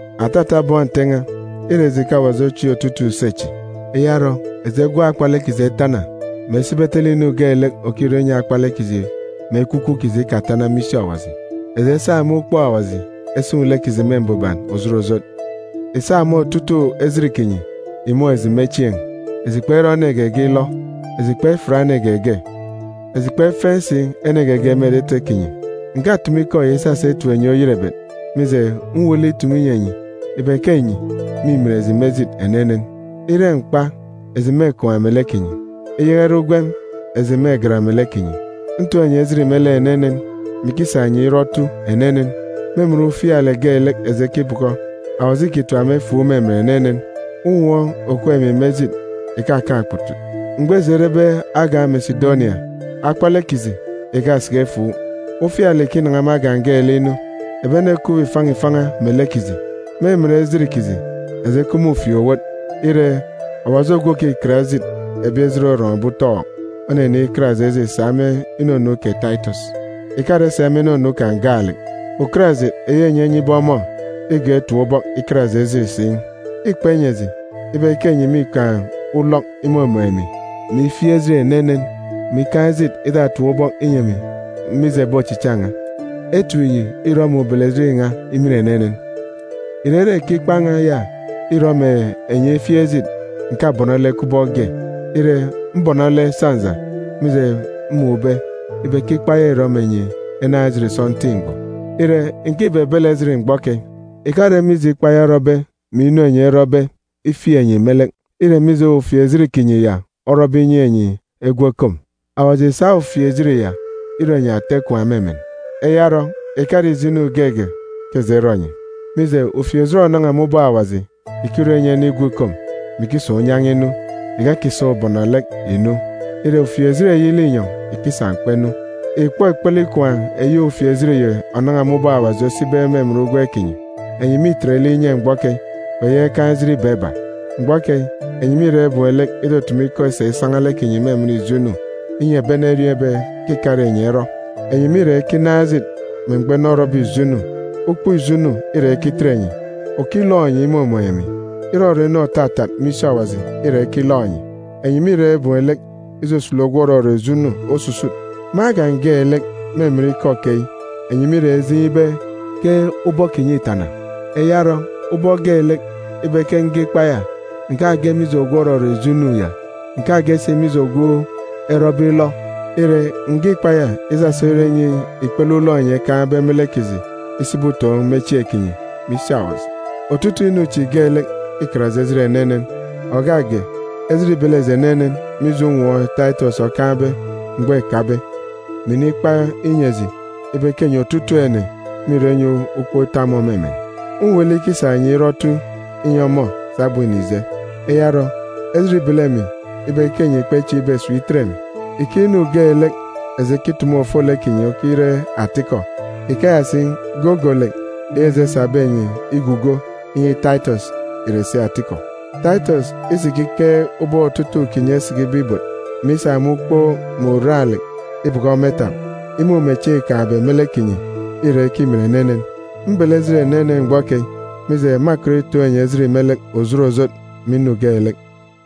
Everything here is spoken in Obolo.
Atata bọn Nte n̄a, îre eji ke Awaji ochieek otutuuk use chi. Eya orọ, eji egwọk akpalek kiji etana, mè esibi etele inu geelek òkichaka mbuban me lek akpalek kiji mè ekwukwu kiji. Eji esa me ukpook Awaji esun̄ lek kiji me mbuban òjot òjot. Ìsa me otutuuk ejit kinyi ìmun̄ eji me chieen̄. Eji kperọ ene geege ilọ. Eji kpefiat ene geege. Eji kpefeen̄ si ene geege me etete kinyi. Ǹkatumu ikọ yi isasa itip enyi oyerebet, mije, mwuuk lek itumu inyi enyi ibe ke enyi mîmin eji me ejit enenen. Ire mkpa, eji mêkwaan̄ melek kinyi. Iyaka ire ugwem, eji mêgat melek kinyi. Ntoon̄ enyi ejit me lek enenen, mè ikisa enyi si irọ otu enenen. Me emen ufialek geelek eji ekibọkọ, Awaji îkitap emi efuuk me emen enenen. Unwọọn̄ òkup emi me ejit ìkakaan̄ okputut. Mgbọ eji erebe agan̄ Mesidonia, akpalek kiji ìkasiki efuuk. Ufialek ìkinan̄a me agan̄ geelek inu. Ebi ene ekup ifan̄a ifan̄a melek kiji. Me emen ejit kiji, eji ekup me ufieek-owot. Ire, Awaji ogwu òkikat ejit ebi ejit orọn̄be utọọk, onenikat eji ejit sa me inunu kè Taitọs. Ìkare sa me inunu kan̄ gaalek, ukarajit eyi enyi enyibe ọmọ îgọọk itap ubọk ikat eji ejit si. Îkpa inyi eji ibe ke enyi mîkaan̄ ulọk imumun̄ emi, mè ifieek ejit enenen, mè ikaan̄ ejit itatap ubọk inyi emi, mije ebi ochicha n̄a. Etip yi îrọ mè ubelejit n̄a imin enenen. Ìrere ke ikpa n̄a ya îrọ mè enyi efieek ejit, ǹkabọnọ lek kubọk ge. Ire, mbọnọ lek sọnja, mije mmun̄be ibe ke ikpa ya îrọ mè enyi enaan̄ ejit sọntiik mgbọ. Ire, ǹkibebele ejit mgbọ keyi. Ìkare mije ikpa ya orọbe mè inu enyi erọbe ifieek enyi me lek. Îre mije ufieejit kinyi ya orọbe inyi enyi egwu ekom. Awaji ìsa ufieejit ya irọ enyi ata ikwaan̄ me emen. Eya orọ, ìkare ijo inu geege ke eji erọ enyi. Mije, ufieejit ònan̄a me ubọk Awaji ìkirọ inyi ene igwu ikom, mè ikisa unyan̄a inu, ìkakisa ubọnọlek ìnu. Ire, ufieejit eyi linyọn̄ ìkisa mkpa inu. Ìkpọ ikpele ikwaan̄ eyi ufieejit yi ònan̄a me ubọk Awaji osibe me emen ugwem kinyi! Enyi mîtet lek inye mgbọ keyi, kpeyaka ikaan̄ ejit iba iba. Mgbọ keyi, enyi mîra ibem lek itutumu ikọ isa isan̄a lek kinyi me emen ijo inu, inyi ebi ene eriọọn̄ ibe ke ìkare enyi erọ. Enyi mîra ikinaan̄ ejit me mgbọ ene orọbe ijo inu. Ukpook ijo inu îra ikitet enyi. Òkilọk enyi imumun̄ emi. Irọrọ inu òtatat me isi Awaji îra ikilọk enyi. Enyi mîra ibem lek isusulu ogwu òrọrọ ijo inu osusut. Me agan̄ geelek, me emen ikọ keyi, enyi mîra ijeen̄ ibe ke ubọk kinyi îtana. Eya orọ, ubọk geelek ibe ke nge ikpa ya, ǹkage mije ogwu òrọrọ ijo inu ya, ǹkage si mije ogwu erọbe ilọ. Ire, ǹge ikpa ya isasa irọ inyi ikpele ulọk enyi ekaan̄be me lek kiji isibi utoon̄ me chieen̄ kinyi, me isi Awaji. Otutuuk inu chi geelek îkat eji ejit enenen. Ògak ge, ejit îbele eji enenen mije unwọọn̄ Taitọs okaan̄be mgbọ îkabe, mè inikpa inyi eji ibe ke enyi otutuuk ene mîrọ inyi ukpook ita ọmọ me emen. Mwuuk lek ikisa enyi irọ otu inyi ọmọ sabum înije. Eya orọ, ejit îbele emi ibe ke enyi kpechieek ibe esip itet emi. Ike inu geelek eji ekitumu ofolek kinyi okire atikọ, ikeya si, gogolek eyi eji esabe enyi igugo inyi Taitọs ìre si atikọ. Taitọs isikikeek ubọk otutuuk kinyi esikibe ibot, mè isa me ukpook mè uran-lek ibọkọ ọmọ itap, imumechieen̄ îkaan̄be me lek kinyi îra ikimin enenen. Mbele ejit enenen mgbọ keyi, mije, mâkọt itoon̄ enyi ejit me lek òjot òjot me inu geelek.